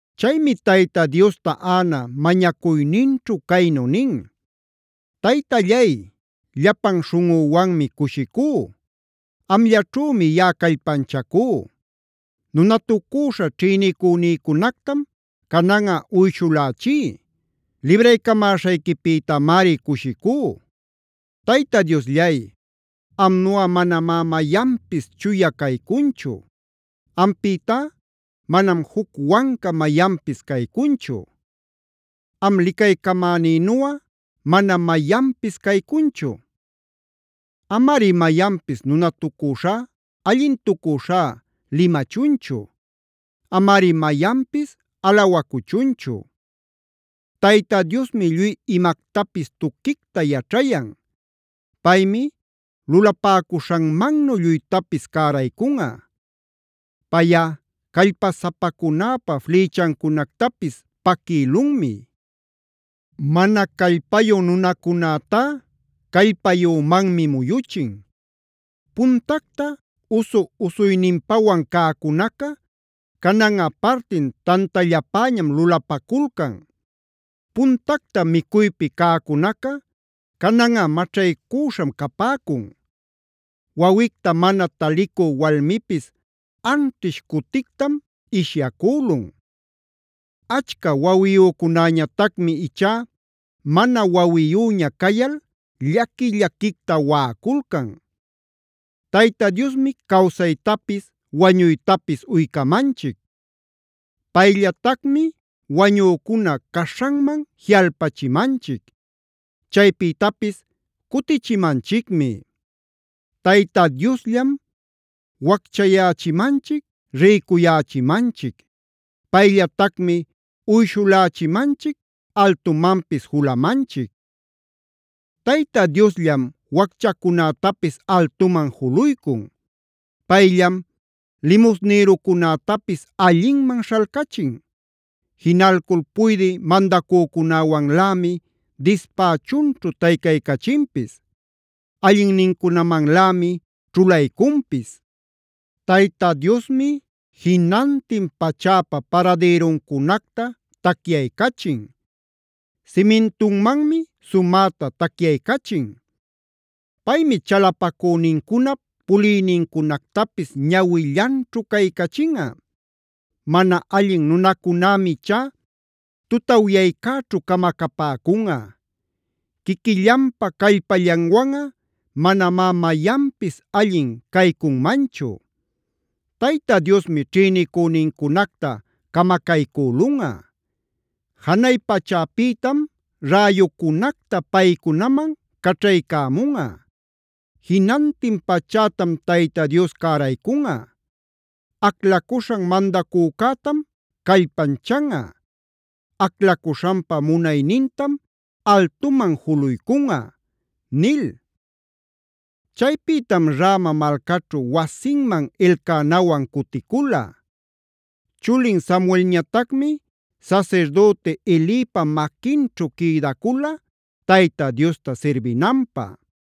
Chaymi Tayta Diosta Ana mañacuyninćhu caynu nin: “Taytallay, llapan śhunꞌüwanmi cushicú.a Amllaćhümi yaꞌa callpanchacú. Nunatucüśha ćhïnicünïcunactam cananꞌa uyshulächí. Libraycamäśhayquipïtamari cushicú. Tayta Diosllay, amnuꞌa manamá mayanpis chuya caycunchu. Ampïtá manam juc wanca mayanpis caycunchu. Am licaycamänïnuꞌa manam mayanpis caycunchu. Amari mayanpis nunatucüśhá, allintucüśhá limachunchu. Amari mayanpis alawacuchunchu. Tayta Diosmi lluy imactapis tuquicta yaćhayan; Paymi lulapäcuśhanmannu lluytapis cäraycunꞌa. Payꞌa callpasapacunäpa flïchancunactapis paquïlunmi; mana callpayu nunacunätá callpayümanmi muyuchin. Puntacta usu-usuyninpawan cäcunaca cananꞌa partin tantallapäñam lulapaculcan. Puntacta micuypi cäcunaca cananꞌa maćhaycüśham capäcun. Wawicta mana talicü walmipis anćhish cutictam ishyacülun. Achca wawiyücunäñatacmi ichá mana wawiyüña cayal llaqui-llaquicta waꞌaculcan. Tayta Diosmi cawsaytapis wañuytapis uycamanchic. Payllatacmi wañücuna caśhanman jiꞌalpachimanchic; chaypïtapis cutichimanchicmi. Tayta Diosllam wacchayächimanchic, rïcuyächimanchic. Payllatacmi uyshulächimanchic, altumanpis julumanchic. Tayta Diosllam wacchacunätapis altuman juluycun; Payllam limusnïrucunätapis allinman śhalcachin. Jinalcul puydï mandacücunawanlämi dispächunćhu taycaycachinpis; allinnincunamanlämi ćhulaycunpis. Tayta Diosmi jinantin pachäpa paradïruncunacta tacyaycachin; simintunmanmi sumäta tacyaycachin. Paymi chalapacünincunap puliynincunactapis ñawillanćhu caycachinꞌa. Mana allin nunacunämi ichá tutawyaycäćhu camacapäcunꞌa. Quiquillanpa callpallanwanꞌa manamá mayanpis allin caycunmanchu. Tayta Diosmi ćhïnicünincunacta camacaycülunꞌa; janay pachäpïtam räyucunacta paycunaman caćhaycämunꞌa. Jinantin pachätam Tayta Dios cäraycunꞌa; aclacuśhan mandacücätam callpanchanꞌa; aclacuśhanpa munaynintam altuman juluycunꞌa” nil. Chaypïtam Rama malcaćhu wasinman Elcanawan cuticula. Chulin Samuelñatacmi sasirdüti Elipa maquinćhu quïdacula Tayta Diosta sirbinanpä.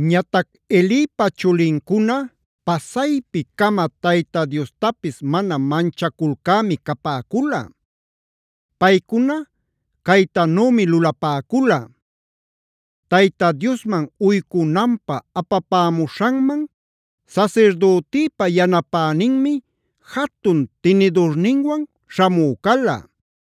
Ñatac Elipa chulincuna pasaypi-cama Tayta Diostapis mana manchaculcämi capäcula. Paycuna caytanümi lulapäcula: Tayta Diosman uycunanpä apapämuśhanman sasirdütïpa yanapäninmi jatun tinidurninwan śhamü cala.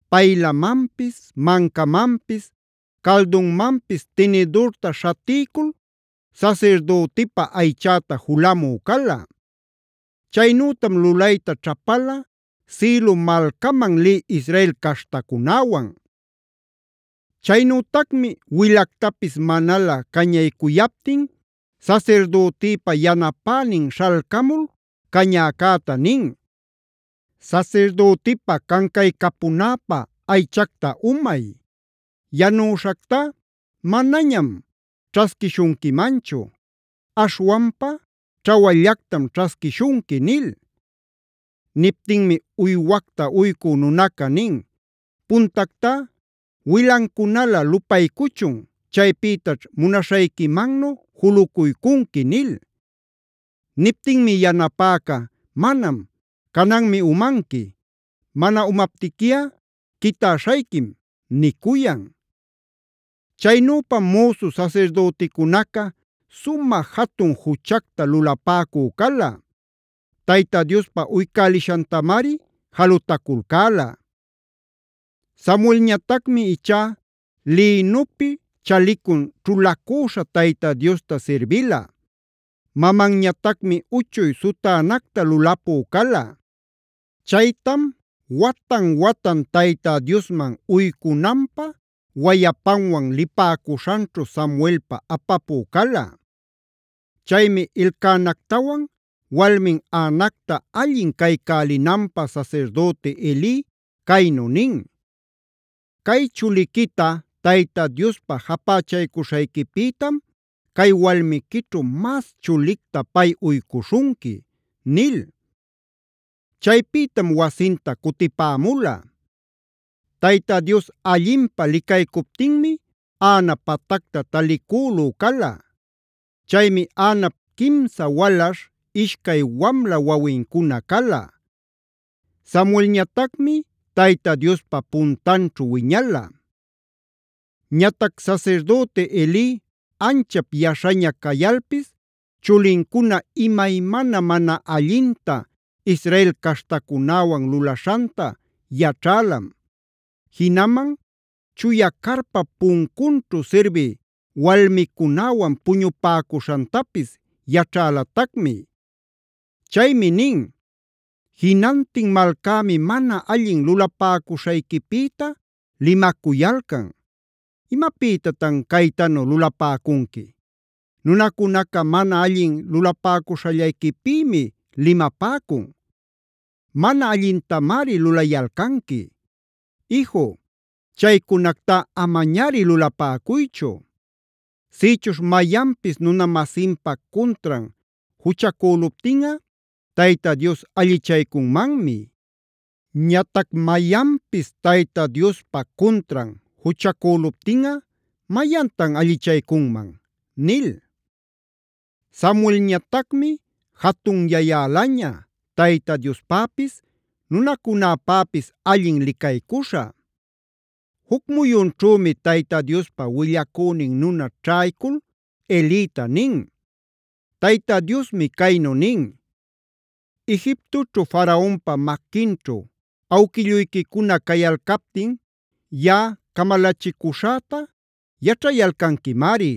paylamanpis, mancamanpis, caldunmanpis tinidurta śhatiycul sasirdütipä aychäta julamü cala. Chaynütam lulayta ćhapala Silo malcaman lï Israel caśhtacunäwan. Chaynütacmi wilactapis manalä cañaycuyaptin sasirdütïpa yanapänin śhalcamul cañäcäta nin: “Sasirdütipa cancaycapunäpä aychacta umay. Yanüśhactá manañam ćhasquishunquimanchu; aśhwanpa ćhawallactam ćhasquishunqui” nil. Niptinmi uywacta uycü nunaca nin: “Puntactá wilancunalä lupaycuchun. Chaypïtaćh munaśhayquimannu julucuycunqui” nil. Niptinmi yanapäca: “Manam, cananmi umanqui. Mana umaptiquiꞌa quitäśhayquim” nicuyan. Chaynüpam müsu sasirdüticunaca sumä jatun juchacta lulapäcü cala; Tayta Diospä uycälishantamari jalutaculcäla. Samuelñatacmi ichá lïnupi chalicun ćhulacüśha Tayta Diosta sirbila. Mamanñatacmi uchuy sutänacta lulapü cala. Chaytam watan-watan Tayta Diosman uycunanpä wayapanwan lipäcuśhanćhu Samuelpä apapü cala. Chaymi Elcanactawan walmin Anacta allin caycälinanpä sasirdüti Eli caynu nin: “Cay chuliquita Tayta Diospä japächaycuśhayquipïtam cay walmiquićhu mas chulicta pay uycuśhunqui” nil. Chaypïtam wasinta cutipämula. Tayta Dios allinpä licaycuptinmi Ana patacta talicülü cala. Chaymi Anap quimsa walaśh, ishcay wamla wawincuna cala. Samuelñatacmi Tayta Diospa puntanćhu wiñala. Ñatac Sasirdüti Eli anchap yaśhaña cayalpis chulincuna imaymana mana allinta Israel caśhtacunäwan lulaśhanta yaćhälam; jinaman chuya carpap puncunćhu sirbï walmicunäwan puñupäcuśhantapis yaćhalatacmi. Chaymi nin: “Jinantin malcämi mana allin lulapäcuśhayquipïta limacuyalcan. ¿¡Imapïtatan caytanu lulapäcunqui!? Nunacunaca mana allin lulapäcuśhallayquipïmi limapäcun. Mana allintamari lulayalcanqui. Iju, chaycunactá amañari lulapäcuychu. Sïchuśh mayanpis nuna-masinpa cuntran juchacüluptinꞌa Tayta Dios allichaycunmanmi. Ñatac mayanpis Tayta Diospa cuntran juchacüluptinꞌa, ¿mayantan allichaycunman?” nil. Samuelñatacmi jatunyayälaña, Tayta Diospäpis, nunacunäpäpis allin licaycuśhä. Juc muyunćhümi Tayta Diospa willacünin nuna ćhaycul Elita nin: “Tayta Diosmi caynu nin: ‘Egiptoćhu Faraonpa maquinćhu awquilluyquicuna cayalcaptin yaꞌa camalachicuśhäta yaćhayalcanquimari.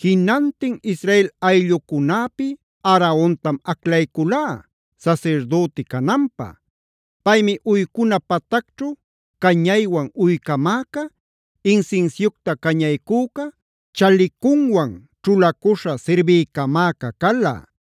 Jinantin Israel ayllucunäpi Aarontam aclayculá sasirdüti cananpä. Paymi uycuna patacćhu cañaywan uycamäca, insinsiucta cañaycüca chalicunwan ćhulacuśhab sirbiycamäca cala.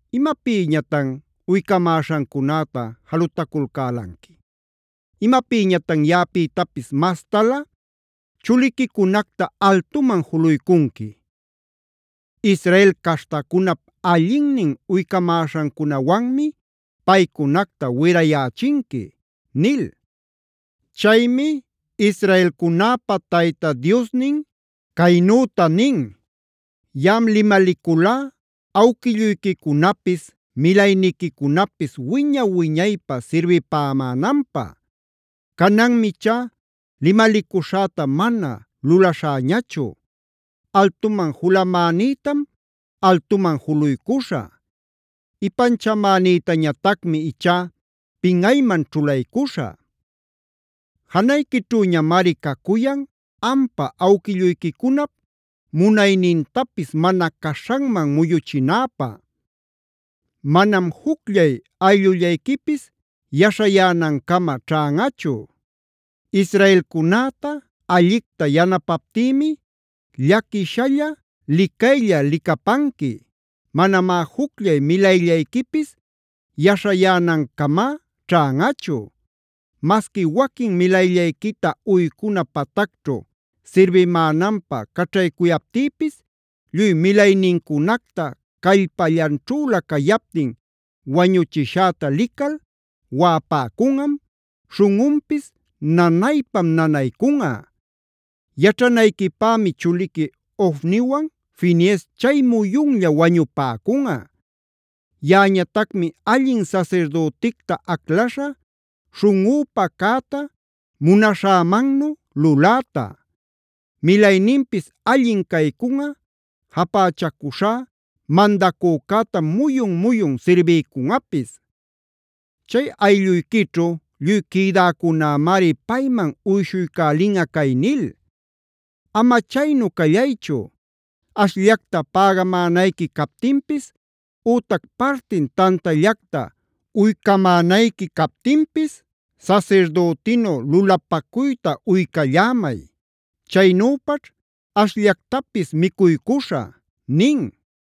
¿Imapïñatan uycamäśhancunäta jalutaculcälanqui? ¿Imapïñatan yaꞌapïtapis mastalä chuliquicunacta altuman juluycunqui? Israel caśhtacunap allinnin uycamäśhancunawanmi paycunacta wirayächinqui’ nil. “Chaymi israelcunäpa Tayta Diosnin caynüta nin: ‘Yaꞌam limaliculá awquilluyquicunapis, milayniquicunapis wiña-wiñaypä sirbipämänanpä. Cananmi ichá limalicuśhäta mana lulaśhäñachu. Altuman julamänïtam altuman juluycuśhä; ipanchamänïtañatacmi ichá pinꞌayman ćhulaycuśhä. Janayquićhüñamari cacuyan ampa awquilluyquicunap munaynintapis mana caśhanman muyuchinäpä. Manam jucllay ayllullayquipis yaśhayänancama ćhanꞌachu. Israelcunäta allicta yanapaptïmi llaquishalla licaylla licapanqui. Manamá jucllay milayllayquipis yaśhayänancama ćhanꞌachu. Masqui waquin milayllayquita uycuna patacćhu sirbimänanpä caćhaycuyaptïpis lluy milaynincunacta callpallanćhüla cayaptin wañuchishäta lical waꞌapäcunꞌam, śhunꞌunpis nanaypam nanaycunꞌa. Yaćhanayquipämi chuliqui Ofniwan Finees chay muyunlla wañupäcunꞌa. Yaꞌañatacmi allin sasirdüticta aclaśha śhunꞌüpa cäta, munaśhämannu luläta. Milayninpis allin caycunꞌa, japächacuśhá mandacücätam muyun-muyun sirbiycunꞌapis. Chay aylluyquićhu lluy quïdäcunämari payman uyshuycälinꞌa cay nil: Ama chaynu callaychu, ashllacta pägamänayqui captinpis ütac partin tantallacta uycamänayqui captinpis sasirdütinu lulapacuyta uycallämay. Chaynüpaćh ashllactapis micuycuśhä’” nin.